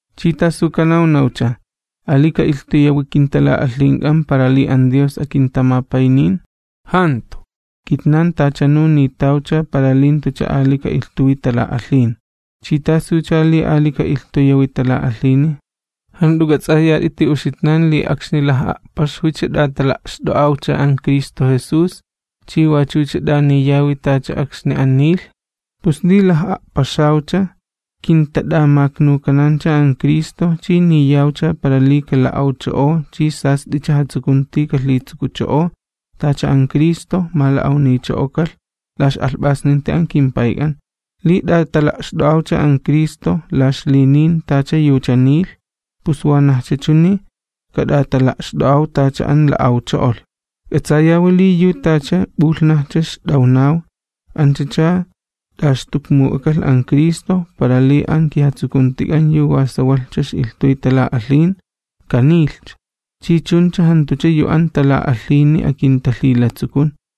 ¿Chi tasu kanawnawcha? ¿Ali ka'ilhtuyawi kintala'alhink'an para li an Dios akintamapaynin? ¡Jantu! Kitnan tachanu nitawcha para li jantucha ali ka'ilhtuwi tala'alhin. ¿Chi tasucha li ali ka'ilhtuyawi tala'alhini? ¿Jant'u k'ats'ayat'iti uxitnan li akxni laj'a'paxwicha t'atala'xt'o'awcha an Cristo Jesús chi wachucha t'aniyawi tacha akxni an nilh? Pus li laj'a'paxawcha kintat'amaknukanancha an Cristo chi niyawcha para li kala'awcho'o chi sast'icha jatsukunti kalhitsukucho'ow, tacha an Cristo mala'awnicho'okalh la ix'alhp'asninti an kimPayk'an. Li t'atala'xt'o'awcha an Cristo la ixlinin tacha yucha nilh, pus wanajcha chuni kat'atala'xt'o'aw tacha an la'awcho'olh. K'atsayawi li yu tacha p'ulhnajcha ixt'awnaw, anchacha t'axtukmuk'akalh an Cristo, para li an kijatsukuntik'an yu wa sawalhcha ix'ilhtuy tala'alhin, kanilhcha, chi chuncha jantucha yu an tala'alhini akintalhilatsukun.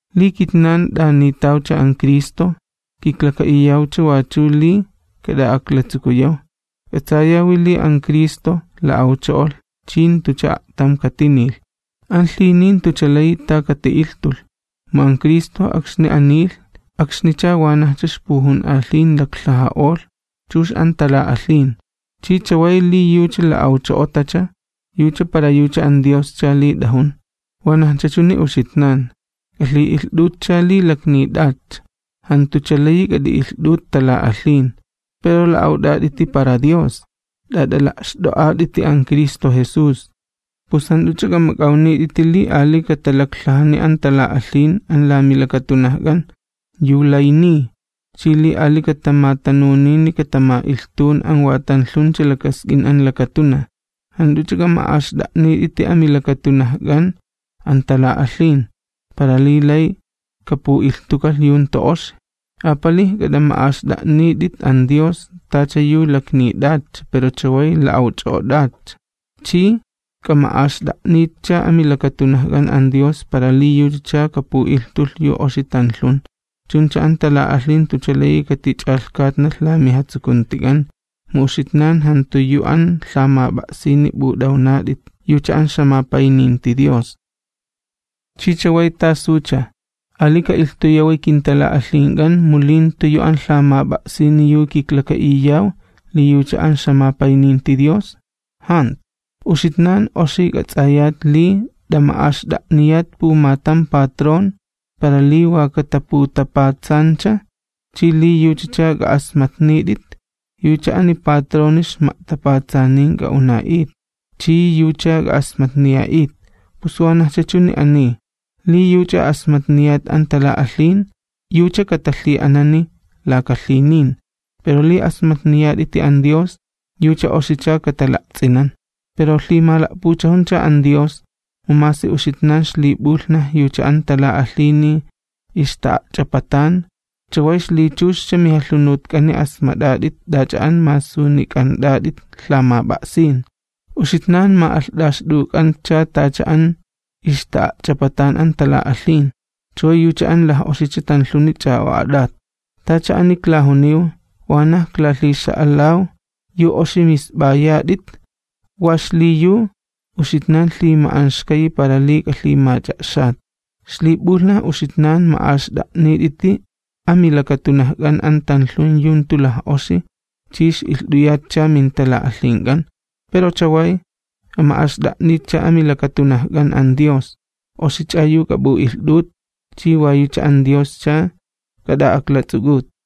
Li kitnan t'anitawcha an Cristo, kiklaka'iyawcha wachu li kat'a'aklatsukuyaw. K'atsayawi li an Cristo, la'awcho'olh chi jantucha a'tam katinilh. An lhinin jantucha layi ta kati'ilhtulh. Mu an Cristo akxni an nilh, akxnicha wanajcha ixpujun'alhin laklhaja'olh chux an tala'alhin, chi chaway li yucha la'awcho'otacha, yucha para yucha an Dioscha li t'ajun. Wanajcha chuni uxitnan, k'alhi'ilht'utcha li laknit'atcha, jantucha layi k'at'i'ilht'ut tala'alhin, pero la'awt'at'iti para Dios, t'at'ala'xt'o'at'iti an Cristo Jesús. Pus jant'uch'a k'amak'awnit'iti li ali katalaklhajani an tala'alhin an la milakatunajk'an, yu lay niy, chi li ali katamatanunini katama'ilhtun an wa tanlhuncha lakask'in an lakatunaj. Jant'uch'a k'ama'axt'a'nit'iti amilakatunajk'an an tala'alhin, para li lay kapu'ilhtukalh yu jantu oxi. Apalij k'at'ama'axt'a'nit'it an Dios, tacha yu laknit'atcha, pero chaway la'awch'o'ot'atcha, chi k'ama'axt'a'nitcha amilakatunajk'an an Dios para li yuchacha kapu'ilhtulh yu oxi tanlhun. Chuncha an tala'alhin jantucha layi katich'alhkatnalh la mijatsukuntik'an, mu uxitnan jantu yu an lhamap'a'sini p'ut'awnat'it yucha an ixjamapayninti Dios. ¿Chi chaway tasucha? ¿Ali ka'ilhtuyawi kintala'alhink'an mu li jantu yu an lhamap'a'sini yu kiklaka'iyaw li yucha an ixjamapayninti Dios? ¡Jantu! Uxitnan oxi k'ats'ayat li t'ama'axt'a'niyat pumatam patrón para li wa kataputapatsancha chi li yuchacha k'a'asmatnit'it, yucha ani patroni ixma'tapatsanin k'a'una'it chi yucha k'a'asmatniya'it. Pus wanajcha chuni ani, li yuch'a asmatniyat an tala'alhin, yucha katalhi'ananiy laka lhinin, pero li asmatniyat'iti an Dios, yucha oxicha katala'ts'inan. Pero lhimala'puchajuncha an Dios, mu masi uxitnan ixlip'ulhnaj yucha an tala'alhini ixta'a'ch'apatan, chaway ixlichuxcha mijalhunutk'ani asmat'at'it t'ach'a an masunik'ant'at'it lhamap'a'sin. Uxitnan ma'alht'axt'uk'antcha tacha an ixta'a'ch'apatan an tala'alhin, chaway yucha an laj'oxicha tanlhuni ch'a'o'at'at. Tacha ani klajuniw, wanaj klalhixa'alaw yu oxi misp'ayat'it, wa xliyu uxitnan lhima'anxkayi para li k'alhimach'a'xat. Ixlip'ulhnaj uxitnan ma'axt'a'nit'iti amilakatunajk'an an tanlhun yu jantu laj'oxi chi ix'ilht'uyatcha mintala'alhink'an, pero chaway k'ama'axt'a'nitcha amilakatunajk'an an Dios, oxich'a yu k'ap'u'ilht'ut chi wa yucha an Dioscha k'at'a'aklats'uk'ut.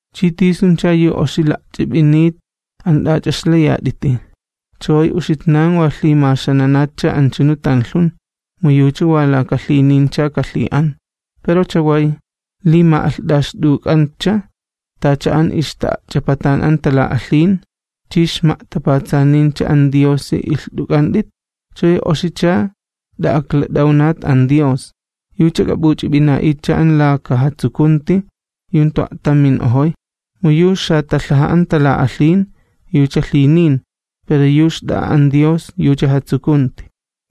¿Chi tisuncha yu oxi la'ch'ip'init an t'ach'a ixlayat'iti? Chaway uxitnan wa lhimaxananatcha anchunu tanlhun, mu yucha wa laka lhinincha kalhi'an. Pero chaway, li ma'alht'axt'uk'antcha tacha an ixta'a'ch'apatan an tala'alhin, chi ixma'tapatsanincha an Diosi ilht'uk'ant'it, chaway oxicha t'a'aklat'awnat an Dios, yucha k'ap'uch'ip'ina'itcha an laka jatsukunti yu jantu a'tam min'ojoy. Mu yu xatalhaja an tala'alhin, lhinin, pero yu xt'a'a an Dios yucha jatsukunti,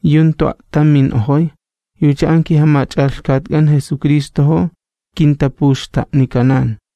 yu jantu a'tam min'ojoy, yucha an kiJamach'alhkatk'an Jesucristojo kintapuxta'nikanan.